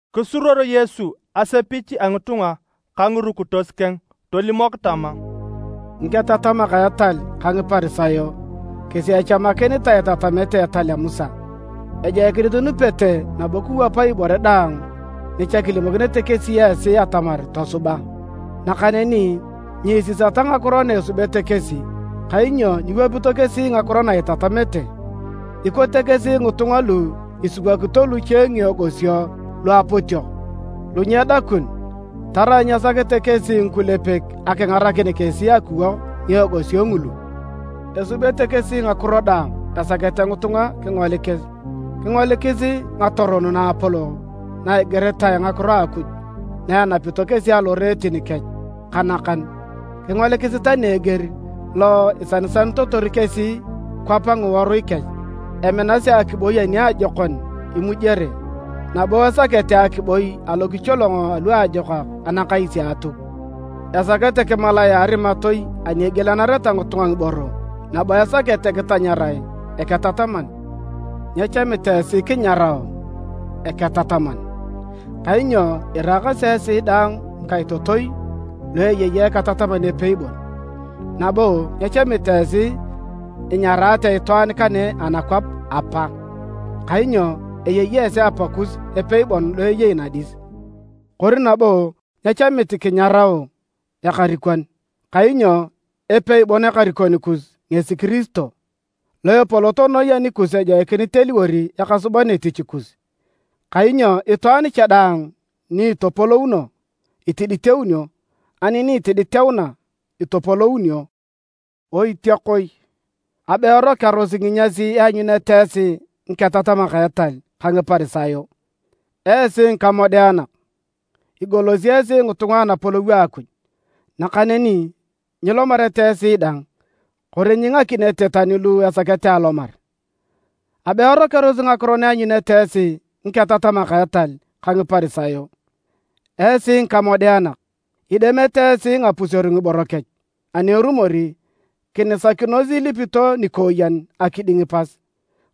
Kisuruor Yesu asepich a ngitunga ka ngirukitos keng. Tolimok tama, “Ngiketatamak a etal ka Ngiparisayo kesi echamakinitae itatamete etal a Musa. Ejoikinit inupete nabo kiwapa ibore daang ni cha kilimokinete kesi esi atamar tosuba. Nakaneni nyiisisata ngakiro na esubete kesi, kainyo nyiwapito kesi ngakiro na itatamete. Ikote kesi ngitunga lu isiwokito luche ngiegosio luapotiok lu nyedakun tarai nyesakete kesi ngikulepek akingarakin kesi akiwok ngiegosio ngulu. Esubete kesi ngakiro daang esakete ngitunga kingolikis. Kingolikisi ngatoron naapolok na igiritae ngakiro a Akuj na enapito kesi aloreetin kech ka nakan! Kingolikisi tani eger lo isanisanitotor kesi kwap ngiworui kech. Eminasi akiboi aniajokon imujere, nabo esakete akiboi alokicholongo aluajokak anakais a Atuk. Esakete kimalae a arimatoi ani egielanareta ngitunga ngiboro nabo esakete kitanyarae, ‘Eketataman’. Nyechamit esi kinyarao: ‘Eketataman’, kainyo iraakasi esi daang ngikaitotoi lu eyei Eketataman epei bon. Nabo nyechamit esi inyaraate itwaan kane anakwap: ‘Apa’, kainyo eyei esi Apakus epei bon lo eyei nadis. Kori nabo nyechamit kinyarao: ‘Ekarikon’, kainyo epei bon Ekarikon kus ngesi Kiristo. Lo epolot noi anikus ejoikinit eliwor ekasuban etich kus. Kainyo itwaan cha daang ni itopolouno, itiditeunio, ani ni itiditeuna, itopolounio. “Oitiakoi! Abe erokearosi nginyas ianyunete esi ngiketatamak a etal ka Ngiparisayo! Esi ngikamodeanak! Igolosi esi ngitunga anapolou a Akuj, nakaneni nyilomete esi dang kori nyingakinete tani lu esakete alomar! [ Abe erokearosi ngakiro na ianyunete esi ngiketatamak a etal ka Ngiparisayo! Esi ngikamodeanak! Idemete esi ngapuseru ngiboro kech, ani erumor, kinisakinos ilipito nikooyen akiding pas.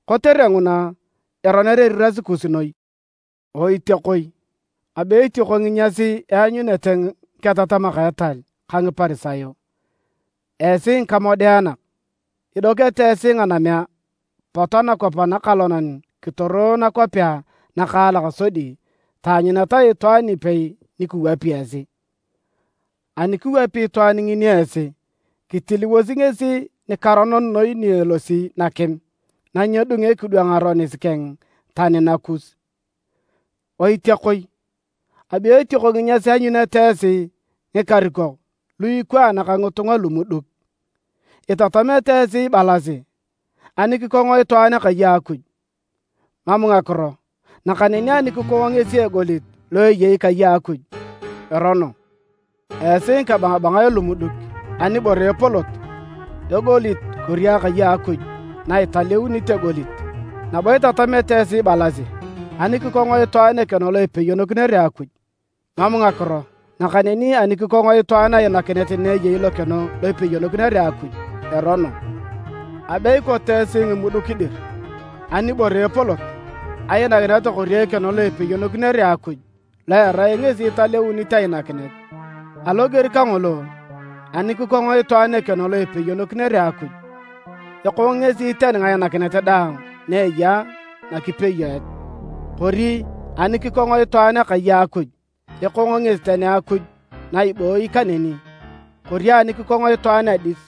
Kotere nguna, eroner eriras kus noi.] “Oitiakoi, Abe etioko nginyas eanyunete ngiketatamak a etal ka Ngiparisayo! Esi ngikamodeanak! Idokete esi nganamea pot anakwap anakalonan kitoro nakwapea nakaalak sodi taanyuneta itwaan ipei ni kiwapi esi. Ani kiwapi itwaan ngini esi, kitiliwosi ngesi nikaronon noi ni elosi nakim na nyedunge kidwang aronis keng tani nakus! “Oitiakoi! Abe etioko nginyas ianyunete esi ngikarikok lu ikwaan ka ngitunga lumuduk! Itatamete esi ibalasi, ‘Ani kikong itwaan akai a Akuj, mam ngakiro. Nakaneni ani kikong ngesi egolit lo eyei kai a Akuj, erono.’ Esi ngikabangabangae lumuduk! Anibore epolot, egolit kori akai a Akuj na italeuni egolit? Nabo itatamete esi ibalasi: ‘Ani kikong itwaan ekeno lo ipeyonokinere Akuj, mam ngakiro. Nakaneni ani kikong itwaan ainakinet na eyei lokeno lo ipeyonokinere Akuj, erono.’ Abe ikote esi ngimuduk dir! Anibore epolot, ainakinet kori ekeno lo ipeyonokinere Akuj lo erai ngesi italeunit ainakinet? Aloger kangolo, ani kikong itwaan ekeno lo ipeyonokinere Akuj, ekong ngesi tani ngainakinet daang na eya nakipeyoet, kori ani kikong itwaan akai a Akuj, ekong ngesi tani Akuj na ibooyi kaneni. Kori ani kikong itwaan Adis,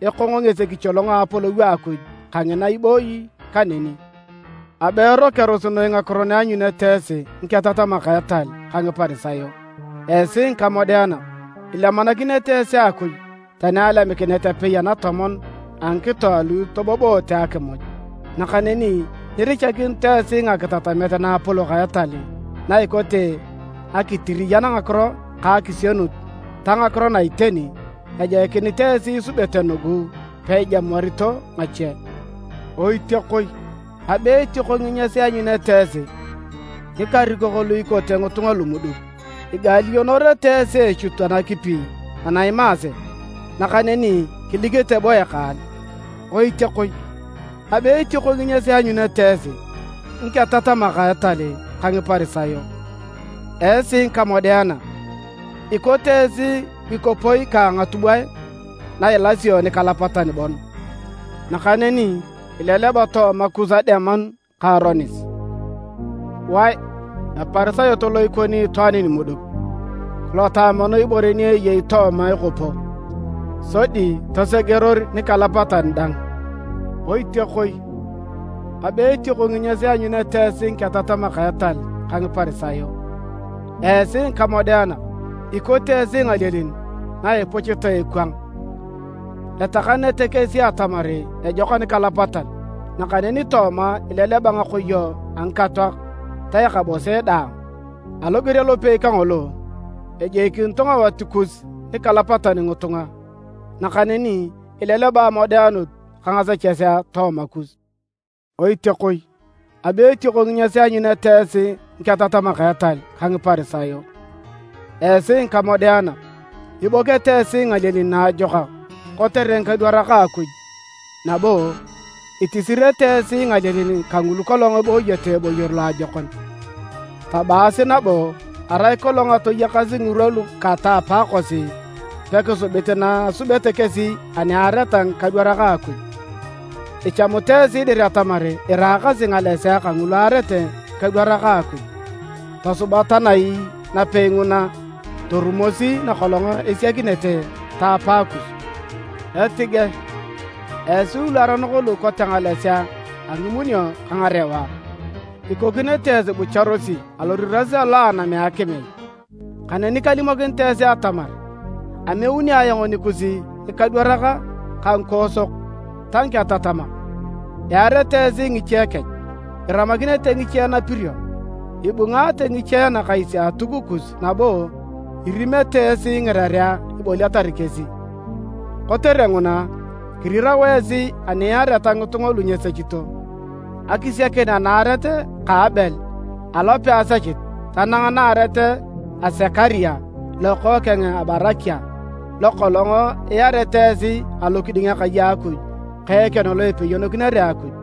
ekong ngesi ekicholong a Apolou a Akuj kangina ibooyi kaneni. “Abe erokearosi noi ngakiro na ianyunete esi ngiketatamak a etal ka Ngiparisayo! Esi ngikamodeanak! Ilemanakinete esi Akuj tani alemikinet apei anatomon a ngikito alu itoboboote akimuj. Nakaneni nyirichakinito esi ngakitatamet naapolok a etal na ikote akitiriyan ngakiro ka akisienut ta ngakiro na iteni. Ejoikinit esi isubete nugu peijamuarito ngache. Oitiakoi! Abe etioko nginyas ianyunete esi! Ngikarikok lu ikote ngitunga lumuduk! Igaalionorete esi eechut anakipi ana imaase, nakaneni kilikete bo ekaal! “Oitiakoi! Abe etioko nginyas ianyunete esi ngiketatamak a etal ka Ngiparisayo! Esi ngikamodeanak! Ikote esi ngikopoi ka ngatubwae na ilasio nikalapatan bon nakaneni ileleba tooma kus ademanu ka aronis. Wae! Eparisayot lo ikoni itwaan nimuduk! Kilota mono ibore ni eyei tooma ekopo, sodi tosegeror nikalapatan dang! “Oitiakoi! Abe etioko nginyas ianyunete esi ngiketatamak a etal ka Ngiparisayo! Esi ngikamodeanak! Ikote esi ngalielin na ipuchitae ekwang, etakanete kesi atamar ejok anikalapatan, nakaneni tooma ileleba ngakoyo a ngikatoak ta ekabose daang. Aloger alopei kangolo, ejoikinito ngawat kus nikalapatan ngitunga, nakaneni ileleba amodeanut ka ngasechesea tooma kus. “Oitiakoi! Abe etioko nginyas ianyunete esi ngiketatamak a etal ka Ngiparisayo! Esi ngikamodeanak! Ibokete esi ngalielin naajokak kotere ngikadwarak a Akuj nabo itisirete esi ngalielin kangulu kolong ebooyete eboyor loajokon, tabaasi nabo: arai kolong atoyakas ngirwa lu kata apakosi pekisubit na asubete kesi ani aareta ngikadwarak a Akuj. Ichamut esi dir atamar iraakasi ngalesea kangulu aarete ngikadwarak a Akuj. Tosuba tanai napei nguna torumosi nakolong esiakinete ta apaakus! Etige esi luaronok lu ikote ngalesea a ngimunio ka ngarewa! Ikokinete esi ibucharosi aloriras alo a anam a akim ai? Kaneni kalimokinit esi atamar ameuni ayong nikus ngikadwarak ka ngikoosok ta ngiketatamak. Iarete esi ngiche kech, iramakinete ngiche napirio, ibungaate ngiche anakais a Atuk kus nabo irimete esi ngirerea iboliatar kesi. Kotere nguna, kirirao esi ani iareta ngitunga lu nyesechito, akisiakin anaaret ka Abel alo peasechit tanang naaret a Sekaria lokookeng a Barakia lokolong iarete esi alokiding Akai a Akuj ka ekeno lo ipeyonokinere Akuj.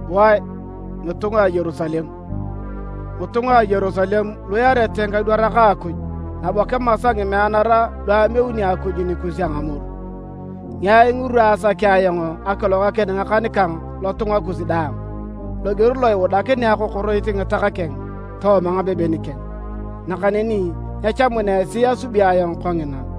“Wae! Ngitunga a Yerusalem! Ngitunga a Yerusalem lu iarete ngikadwarak a Akuj nabo kimasa ngimeanara lu ameuni Akuj nikus a ngamoru! Ngiai ngirwa asakea ayong akilogakin ngakan kang lotunga kus daang, loger lo iudanakinea akokoroit ngitak keng tooma ngabeben keng, nakaneni nyechamuna esi asubi ayong kongina!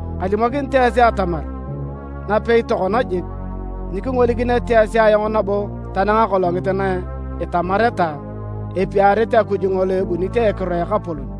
Kalimokinit esi atamar, napei tokona jik, nyikingolikinete esi ayong nabo tanang akolongit na itamareta: ‘Epiarit Akuj ngolo ebunit a ekiro a Ekapolon.’”